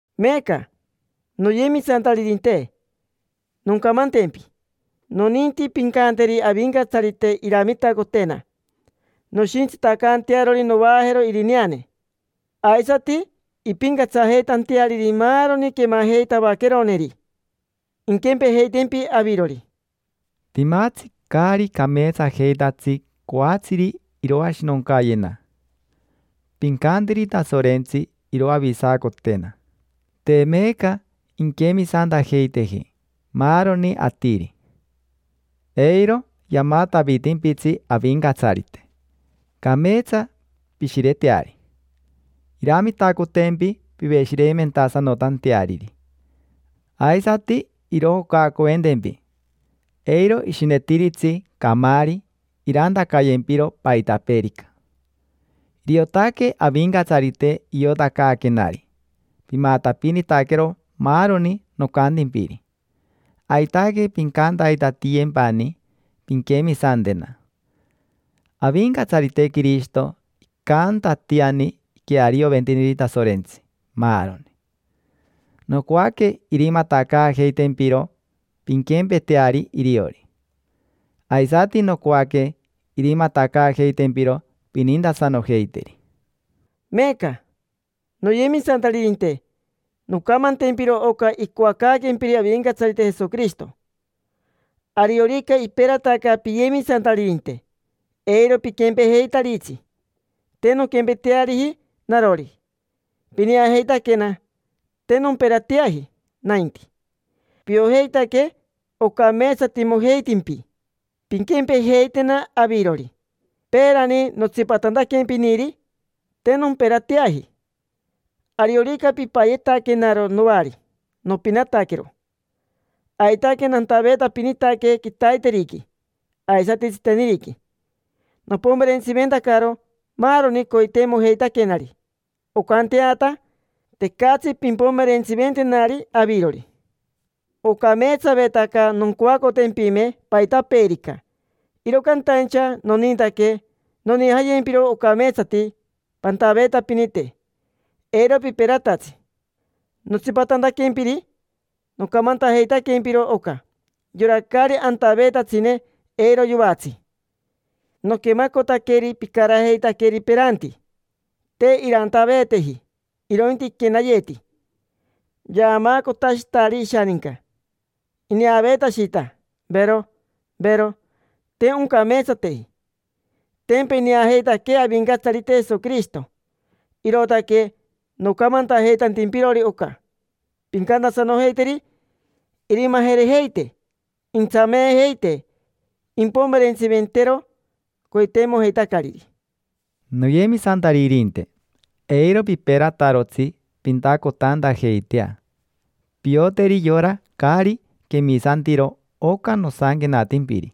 Meeca, noyemisantaririnte, noncamantempi. Noninti pincanteri Avincatsarite iramitacotena noshintsitacantearori novaajero irineane, aisati impincatsajeitanteariri maaroni quemajeitavaqueroneri, inquempejeitempi avirori. Timatsi caari cameetsajeitatsi coatsiri iroashinoncayena. Pincanteri Tasorensti iroavisacotena. Te meeca inquemisantajeiteji maaroni atiri. Eiro yamatavitimpitsi Avincatsarite, cameetsa pishireteari. Iramitacotempi piveshireimentasanotanteariri, aisati irojocaacoventempi: eiro ishinetiritsi camaari irantacayempiro paitapeerica. Iriotaque Avincatsarite iotacaaquenari pimatapinitaquero maaroni nocantimpiri. Aitaque pincantaitatiyempani pinquemisantena. Avincatsarite Quirishito icantatiani iquearioventiniri Tasorentsi maaroni. Nocoaque irimatacaajeitempiro pinquempeteari iriori. Aisati nocoaque irimatacaajeitempiro pinintasanojeiteri. Meeca, noyemisantaririnte, noncamantempiro oca icoacaaquempiri Avincatsarite Jesoquirishito. Ariorica iperataca piyemisantaririnte, eiro piquempejeitaritsi. Te nonquempeteariji narori; pineajeitaquena, te nomperateaji nainti. Piojeitaque ocameetsatimojeitimpi pinquempejeitena avirori. Peerani, notsipatantaquempiniri, te nomperateaji. Ariorica pipayetaquenaro noari, nopinataquero. Aitaque nantaveetapinitaque quitaiteriqui aisati tsiteniriqui. Nopomerentsiventacaro maaroni coiteimojeitaquenari oncanteata tecatsi pimpomerentsiventenari avirori. Ocameetsavetaca noncoacotempime paitapeerica, iro cantaincha nonintaque nonijayempiro ocameetsati pantaveetapinite, eiro piperatatsi. Notsipatantaquempiri nocamantajeitaquempiro oca: yora caari antaveetatsine, eiro yoatsi. Noquemacotaqueri picarajeitaqueri peranti. Te irantaveeteji, irointi iquenayeti yaamaacotashitari ishaninca, ineaveetashita, vero, vero. Te oncameetsateji. Tempa ineajeitaquee Avincatsarite Jesoquirishito, irootaque nocamantajeitantimpirori oca. Pincantasanojeiteri irimajerejeite, intsameejeite, impomerentsiventero coiteimojeitacariri. Noyemisantaririnte, eiro piperatarotsi pintacotantajeitea. Pioteri yora caari quemisantiro oca nosanquenatimpiri.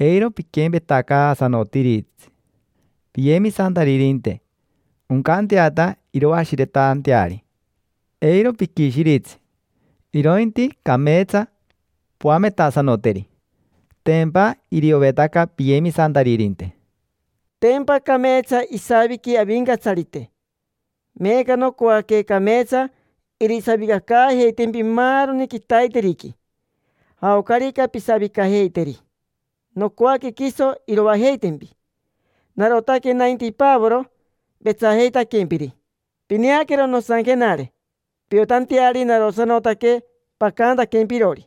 Eiro piquempetacaasanotiritsi piyemisantaririnte, oncanteata iroashiretanteari. Eiro piquishiritsi, irointi cameetsa poametasanoteri: tempa iriovetaca piyemisantaririnte. Tempa cameetsa isaviqui Avincatsarite, meeca nocoaque cameetsa irisavicacaajeitempi maaroni quitaiteriqui, jaocarica pisavicajeiteri. Nocoaque quiso iroajeitempi. Narotaque nainti Pavoro vetsajeitaquempiri. Pineaquero nosanquenare piotanteari narosanotaque pacantaquempirori.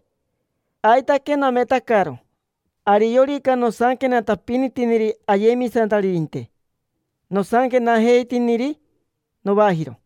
Aitaque nametacaro: ariorica nosanquenatapinitiniri ayemisantaririnte, nosanquenajeitiniri novajiro.